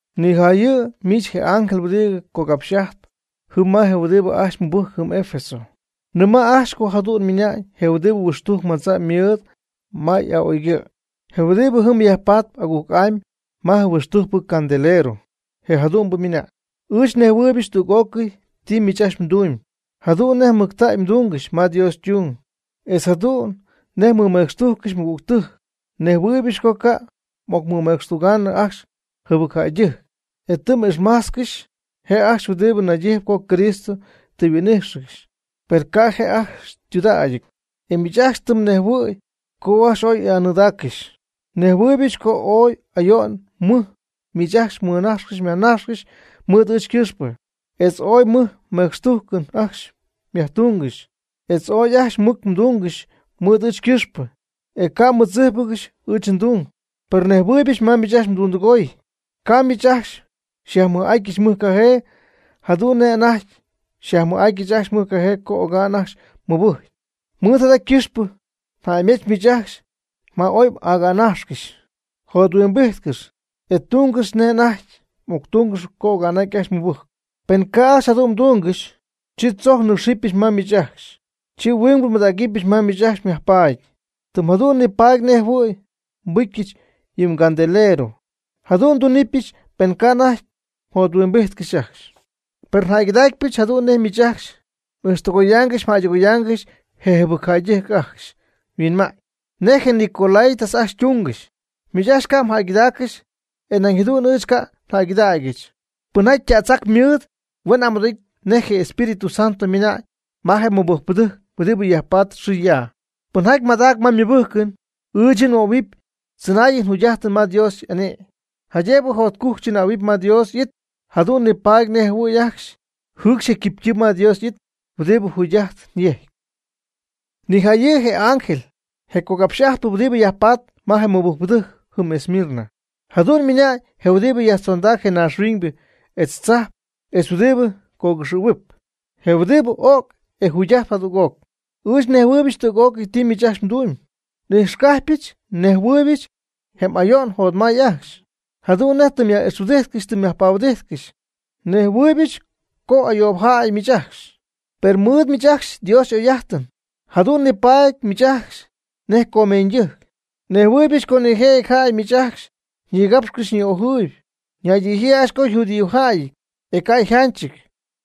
Nijayɨ' miich je ángel huɨdibɨ cogapxy'ajtp jɨm ma je huɨdibɨ ajcxy mɨbɨjcp jɨm Efeso: “Nɨma' ajcxy co jadu'n ymɨnañ je huɨdibɨ huɨxtujc madza' mɨɨd ma y'a'oygɨ', je huɨdibɨ jɨm yajpatp agujc'amy ma je huɨxtujcpɨ candelero, je' jadu'n mɨnamb: Ɨɨch nejhuɨɨybɨch tüg'ócɨy ti miich ajcxy mdumyb, jadu'n nej mɨctägy mdungɨxy ma Dios ytung, etz jadu'n nej mmɨmecxtujccɨxy mɨgügtɨjc. Nejhuɨɨybɨch co ca' m'ocmɨmecxtugaanɨ ajcxy jɨbɨcjäydɨjc, e tɨ m'ijxmajtzcɨxy je ajcxy huɨdibɨ naydijɨp co Cristo tɨ huin'íjxɨgɨxy, per ca' je' ajcxy ytudägyɨty, e miich ajcxy tɨ mnejhuɨ̈y co ajcxy ooy y'anɨɨdaaccɨxy. Nejhuɨɨybɨch co ooy ayo'n mɨj miich ajcxy mmɨnajxcɨxy myajnajxcɨxy mɨɨd ɨɨch ycɨxp, etz ooy mɨj mecxtujcɨn ajcxy myajtungɨxy, etz ooy janch mɨc mdungɨxy mɨɨd ɨɨch ycɨxp, e ca' tɨ mmɨdzíjpɨgɨxy ɨɨch ndung. Per nejhuɨɨybɨch ma miich ajcxy mdundɨgoy. Ca' miich ajcxy xyajmɨj'atyɨch mɨjcajee, jadu'n nej anajty xyajmɨj'atyɨch ajcxy mɨjcajee co oga'n ajcxy mɨbɨjcy. Mɨɨd jada ycɨxpɨ jäymetz miich ajcxy ma oy m'agänajxcɨxy. Jothuimbijtcɨx, e tungɨx nej anajty m'octungɨxp co oga'ñ ajcxy mmɨbɨjcy. Pen ca' ajcxy jadu'n mdungɨxy, chi tzojc nɨ́cxɨbɨch ma miich ajcxy, chi huingbɨ nbɨdägɨbyɨch ma miich ajcxy xyjapaady, tɨm jadu'n nipaady nej jɨhuɨ̈y nbɨcyɨch yɨ mgandelero. Jadu'n ndunɨpyɨch pen ca' anajty mjothuimbity ajcxy. Per njäygɨdaacypɨch jadu'n nej miich ajcxy m'ijxtɨgoydaaygɨxy mjäydɨgoydaaygɨxy je jɨbɨcjäydɨjc ajcxy yhuinma'ñ. Nej je nicolaítas ajcxy ytungɨxy, miich ajcxy ca' mjäygɨdaaccɨxy e nañ jadu'n ɨɨch ca' njäygɨdägyɨch. Pɨnjaty ytädzac mɨɨd huen amɨdoo'ity nej je Espíritu Santo ymɨna'ñ ma je mɨbɨjcpɨdɨjc huɨdibɨ yajpatp xɨ ya. Pɨnjaty madacp ma ymɨbɨjcɨn, ɨɨch yɨ' nmöhuɨpy tzɨnaayɨn jugy'ajtɨn ma Dios y'ane'my, jaydëb jotcujc chɨnähuɨpy ma Dios y'it, jadu'n nipaady nej jɨhuɨ̈y ajcxy jɨɨcxy je quipytɨɨm ma Dios y'it huɨdibɨ jugy'ajtɨn yejcp.” Nijayɨ' je ángel, je cogapxy'ajtpɨ huɨdibɨ yajpatp ma je mɨbɨjcpɨdɨjc jɨm Esmirna: “Jadu'n ymɨna'ñ je huɨdibɨ yajtzondac je naaxhuiñybɨ etz tzajp etz huɨdibɨ cogɨxɨ̈huɨp, je huɨdibɨ o'c e yjugy'aty jadüg'oc: Ɨɨch nejhuɨɨybɨch tüg'ócɨy ti miich ajcxy mdumyb. N'ijxcajpyɨch nnejhuɨɨybɨch je m'ayo'n mjotmay ajcxy, jadu'n nej tɨ myaj'ixhuɨdijtcɨxy tɨ myajpahuɨdijtcɨxy. Nejhuɨɨybɨch co ayoob jäy miich ajcxy, per mɨɨd miich ajcxy Dios y'oy'ajtɨn, e jadu'n nipaady miich ajcxy nej comeeñydɨjc. Nejhuɨɨybɨch co nijëjɨty jäy miich ajcxy xyñigapxyp xyñi'ojɨɨyb. Ñaydijyii ajcxy co yjudíojäyɨty, e ca' yjanchɨty.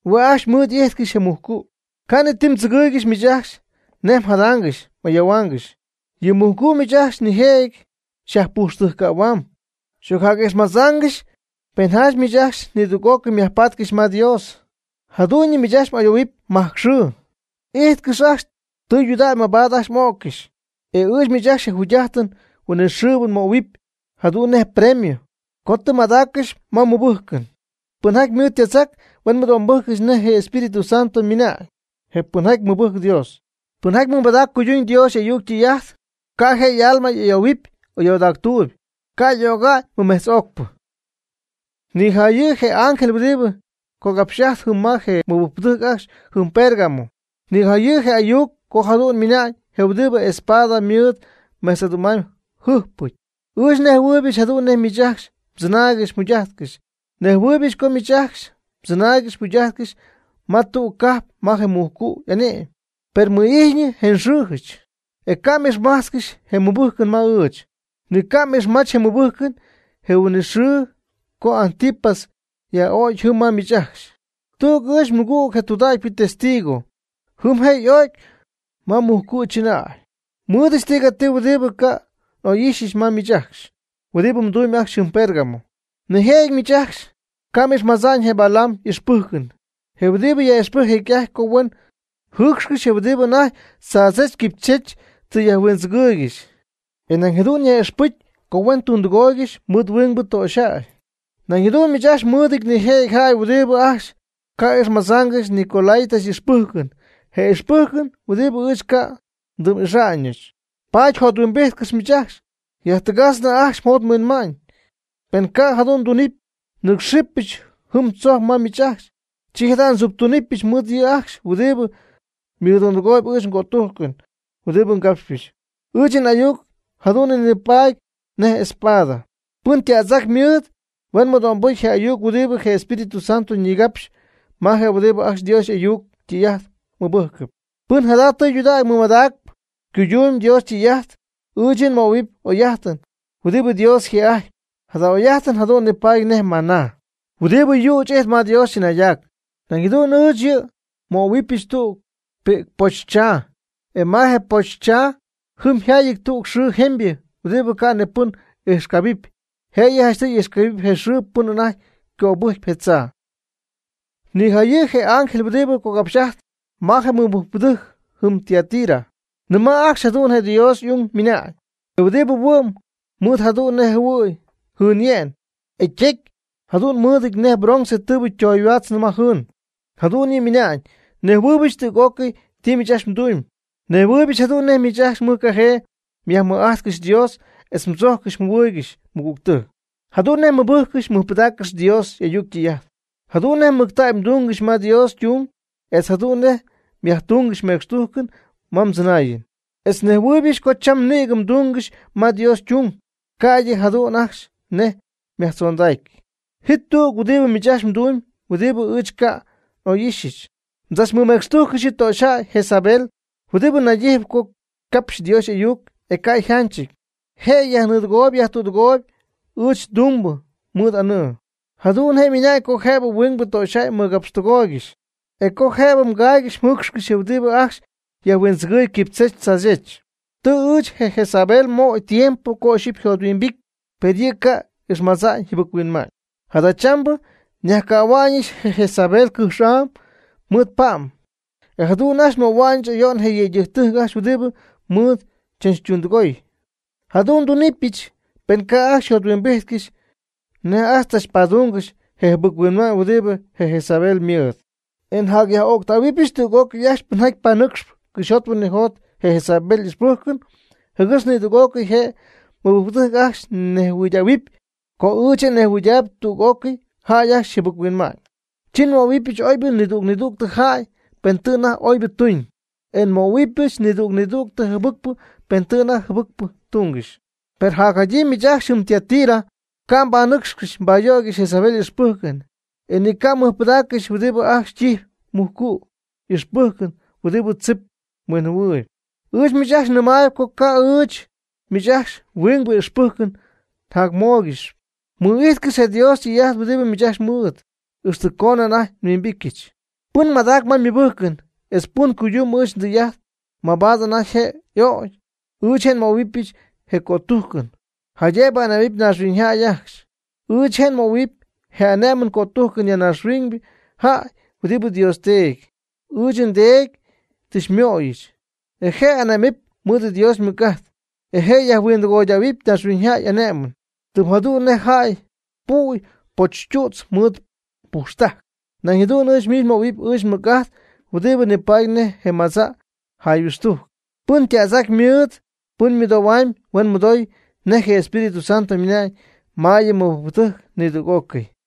Hue' ajcxy mɨɨd y'ijtcɨxy je mujcu'. Ca' ni ti mdzɨgɨ̈y miich ajcxy nej mjadaangɨxy m'ayoohuaangɨxy. Yɨ mujcu' miich ajcxy nijëjɨty xyajpujxtɨjccähuamb, m'ocyaj'ijxmadzangɨxy pen janch miich ajcxy nidüg'ócɨy myajpatcɨxy ma Dios. Jadu'ñyɨ miich ajcxy m'ayohuɨpy majc xɨɨ. Ijtcɨx tudägy mabaad ajcxy m'öccɨxy. E ɨɨch miich ajcxy je jugy'ajtɨn huinɨxɨɨbɨ nmöhuɨpy jadu'n nej premio co tɨ mmadaaccɨxy ma mmɨbɨjcɨn. Pɨnjaty mɨɨd ytädzac, huen mɨdo'mbɨjccɨxy nej je Espíritu Santo nɨmäy je pɨnjaty mɨbɨjcp Dios. Pɨnjaty mɨmadacp cuyduñ Dios y'ayuc ytɨy'ajt, ca' je' y'alma ayoohuɨpy ayoodactuuyb, ca' y'öga'ñ mɨmejtz'ocpɨ.” Nijayɨ' je ángel huɨdibɨ cogapxy'ajtp jɨm ma je mɨbɨjcpɨdɨjc ajcxy jɨm Pérgamo: “Nijayɨ' je ayuc co jadu'n ymɨnañ je huɨdibɨ y'espada mɨɨd mejtz'adu'm'amyb yjɨjpɨty: Ɨɨch nejhuɨydaaybɨch jadu'n nej miich ajcxy mdzɨnaaygɨx mjugy'ajtcɨx. Nejhuɨɨybɨch co miich ajcxy mdzɨnaaygɨxy mjugy'ajtcɨxy ma tüg cajp ma je mujcu' y'ane'my. Per mɨ'ijtyñɨ je nxɨɨjɨch, e ca' m'ixmach je mmɨbɨjcɨn ma ɨɨch. Ni mga'ixmajch je mmɨbɨjcɨn je huin'it xɨɨ co Antipas yaj'o'cɨ jɨm ma miich ajcxy, tüg ɨɨch nmɨgüg, je tudägypɨ testigo, jɨm je' y'o'cy ma mujcu' chɨnäy. Nmɨɨdɨch tigati huɨdibɨ ca' n'oy'ixyɨch ma miich ajcxy huɨdibɨ mdumyb ajcxy jɨm Pérgamo. Nijëjɨty miich ajcxy ca' m'ixmadza'ñ je Balaam y'ixpɨjcɨn, je huɨdibɨ yaj'ixpɨjc jecy'ajty co huen jɨɨcxcɨxy je huɨdibɨ anajty tzaadzech quipychech tɨ yajhuindzɨgɨɨygɨxy. E nañ jadu'n yaj'ixpɨc co huen tundɨgooygɨxy mɨɨd huingbɨ töxyjäy. Nañ jadu'n miich ajcxy mmɨɨdɨty nije' jäy huɨdibɨ ajcxy ca' ixmadzaangɨxy nicolaítas y'ixpɨjcɨn, je ixpɨjcɨn huɨdibɨ ɨɨch ca' ndɨm'ixa'ñɨch. Paady jothuimbijtcɨxy miich ajcxy, yajtɨgajtznɨ ajcxy mjot mhuinma'ñ. Pen ca' jadu'n mdunɨpy, nɨ́cxɨbɨch jɨm tzojc ma miich ajcxy. Chi jada' ndziptunɨpyɨch mɨɨd yɨ' ajcxy huɨdibɨ mɨdundɨgooyb ɨɨch ngötujcɨn huɨdibɨ ngapxpɨch. Ɨɨch n'ayuc jadu'n nipaady nej espada. Pɨn ytädzac mɨɨd, huen mɨdo'mbɨcy je ayuc huɨdibɨ je Espíritu Santo ñigapxyp ma je huɨdibɨ ajcxy Dios y'ayuc ytɨy'ajt mɨbɨjcɨp. Pɨn jada tɨydudägy mɨmadacp cuyduunnɨ Dios ytɨy'ajt, ɨɨch yɨ' nmöhuɨpy oy'ajtɨn huɨdibɨ Dios yjë'ajtpy. Jada oy'ajt jadu'n nipaady nej maná huɨdibɨ yüch ijtp ma Dios chɨnaydac. Nañ jadu'n ɨɨch yɨ' nmöhuɨbɨch tüg pi'cpoobtzaa, e ma je poobtzaa jɨm yjaayɨty tüg xɨɨ jemybɨ huɨdibɨ ca' ni pɨn ijxcabɨpy, jëyɨ janchtɨy ijxcabɨp je xɨɨ pɨn anajty cöbɨjcp je tzaa.” Nijayɨ' je ángel huɨdibɨ cogapxy'ajtp ma je mɨbɨjcpɨdɨjc jɨm Tiatira: “Nɨma' ajcxy, jadu'n je Dios y'ung ymɨna'ñ, je huɨdibɨ yhuin mɨɨd jadu'n nej jɨhuɨ̈y jɨɨnye'n, e ytecy jadu'n mɨɨdɨty nej bronce tɨɨbɨ ytoyhuäch ma jɨɨn: Jadu'n yɨ' ymɨna'ñ: Nejhuɨɨybɨch tüg'ócɨy ti ajcxy mdumyb. Nejhuɨɨybɨch jadu'n nej miich ajcxy mɨjcajee myajmɨj'ajtcɨxy Dios etz mdzojccɨxy mjɨhuɨɨygɨxy ymɨgügtɨjc; jadu'n nej mmɨbɨjccɨxy mmɨjpɨdaaccɨxy Dios y'ayuc ytɨy'ajt; jadu'n nej mɨctägy mdungɨxy ma Dios ytung; etz jadu'n nej myajtungɨxy mecxtujcɨn ma mdzɨnaayɨn; etz nejhuɨɨybɨch co cham nïgɨ mdungɨxy ma Dios ytung, ca'ydɨ jadu'n ajcxy nej myajtzondacy. Ji tüg huɨdibɨ miich ajcxy mdumyb huɨdibɨ ɨɨch ca' n'oy'ixyɨch. Mdzachmɨmecxtujccɨxy yɨ töxyjäy Jezabel huɨdibɨ naydijɨp co ycapxyp Dios y'ayuc e ca' yjanchɨty. Je' yajnɨɨdɨgooyb yajtüdɨgooyb ɨɨch ndumbɨ mɨɨd anɨɨ. Jadu'n je' ymɨna'ñ co jëbɨ huingbɨ töxyjäy mɨgapxtɨgooygɨxy e co jëbɨ caaygɨxy jɨɨcxcɨxy je huɨdibɨ ajcxy yajhuindzɨgɨɨyb quipychech tzaadzech. Tɨ ɨɨch je Jezabel nmöy tiempo co ixyipy yjothuimbity, per yɨ' ca' ixmadza'ñ yjɨbɨc-huinma'ñ. Jadachambɨ nyajcähua'ñɨch je Jezabel cɨjx'am mɨɨd pa'm, e jadu'n ajcxy nmöhua'ñɨch ayo'n je yëydɨjc ajcxy huɨdibɨ mɨɨd chachtundɨgoy. Jadu'n ndunɨpyɨch pen ca' ajcxy yjothuimbijtcɨxy nej ajcxy chachpadungɨxy je jɨbɨc-huinma'ñ huɨdibɨ je Jezabel ymɨɨd. E nyaj'öctähuɨbɨch tüg'ócɨy ajcxy pɨnjaty panɨcxp cɨxyjot huinɨjot je Jezabel y'ixpɨjcɨn jɨgɨx nidüg'ócɨy je mɨbɨjcpɨdɨjc ajcxy nejhuɨydähuɨpy co ɨɨch je' nejhuɨydaayb tüg'ócɨy jäy ajcxy yjɨbɨc-huinma'ñ. Chi nmöhuɨbɨch oybɨ nidüg nidüg jäy pen tɨ anajty oybɨ tuñ, o nmöhuɨbɨch nidüg nidüg jɨbɨcpɨ pen tɨ anajty jɨbɨcpɨ tungɨxy. Per jacjadyii miich ajcxy jɨm Tiatira ca' mbanɨcxcɨxy mbayöygɨxy Jezabel y'ixpɨjcɨn, e ni ca' mmɨjpɨdaaccɨxy huɨdibɨ ajcxy ytijpy mujcu' y'ixpɨjcɨn huɨdibɨ tzip huinjɨhuɨɨyb. Ɨɨch miich ajcxy nɨmaayb co ca'p ɨɨch miich ajcxy huingbɨ ixpɨjcɨn njacmóoygɨxɨpy. Mɨ'ijtcɨxy je Dios ytɨy'ajt huɨdibɨ miich ajcxy mɨɨd, ixtɨ coonɨ anajty nhuimbityɨch. Pɨn madacp ma ymɨbɨjcɨn etz pɨn cuydumb ɨɨch ndɨy'ajt mabaad anajty je' y'ögy, ɨɨch je' nmöhuɨbɨch je cötujcɨn, jaydëb ane'my naaxhuiñyjäy ajcxy. Ɨɨch je' nmöhuɨpy je ane'mɨn cötujcɨn ma naaxhuiñyjäy huɨdibɨ Dios Teedy, ɨɨch nDeedy, tɨ xymöyɨch. E je' ane'mɨpy mɨɨd Dios ymɨc'ajt. E je' yajhuindɨgoydähuɨpy naaxhuiñyjäy y'ane'mɨn, tɨm jadu'n nej jäy püy pochtu'tz mɨɨd pujxtajc. Nañ jadu'n ɨɨch je' nmöhuɨpy ɨɨch nmɨc'ajt huɨdibɨ nipaady nej je madza' jayhuɨxtujc. Pɨn ytädzac mɨɨd, pɨn mɨdoohuamb, huen mɨdoy nej je Espíritu Santo ymɨna'ñ ma yɨ mɨbɨjcpɨdɨjc nidüg'ócɨy.”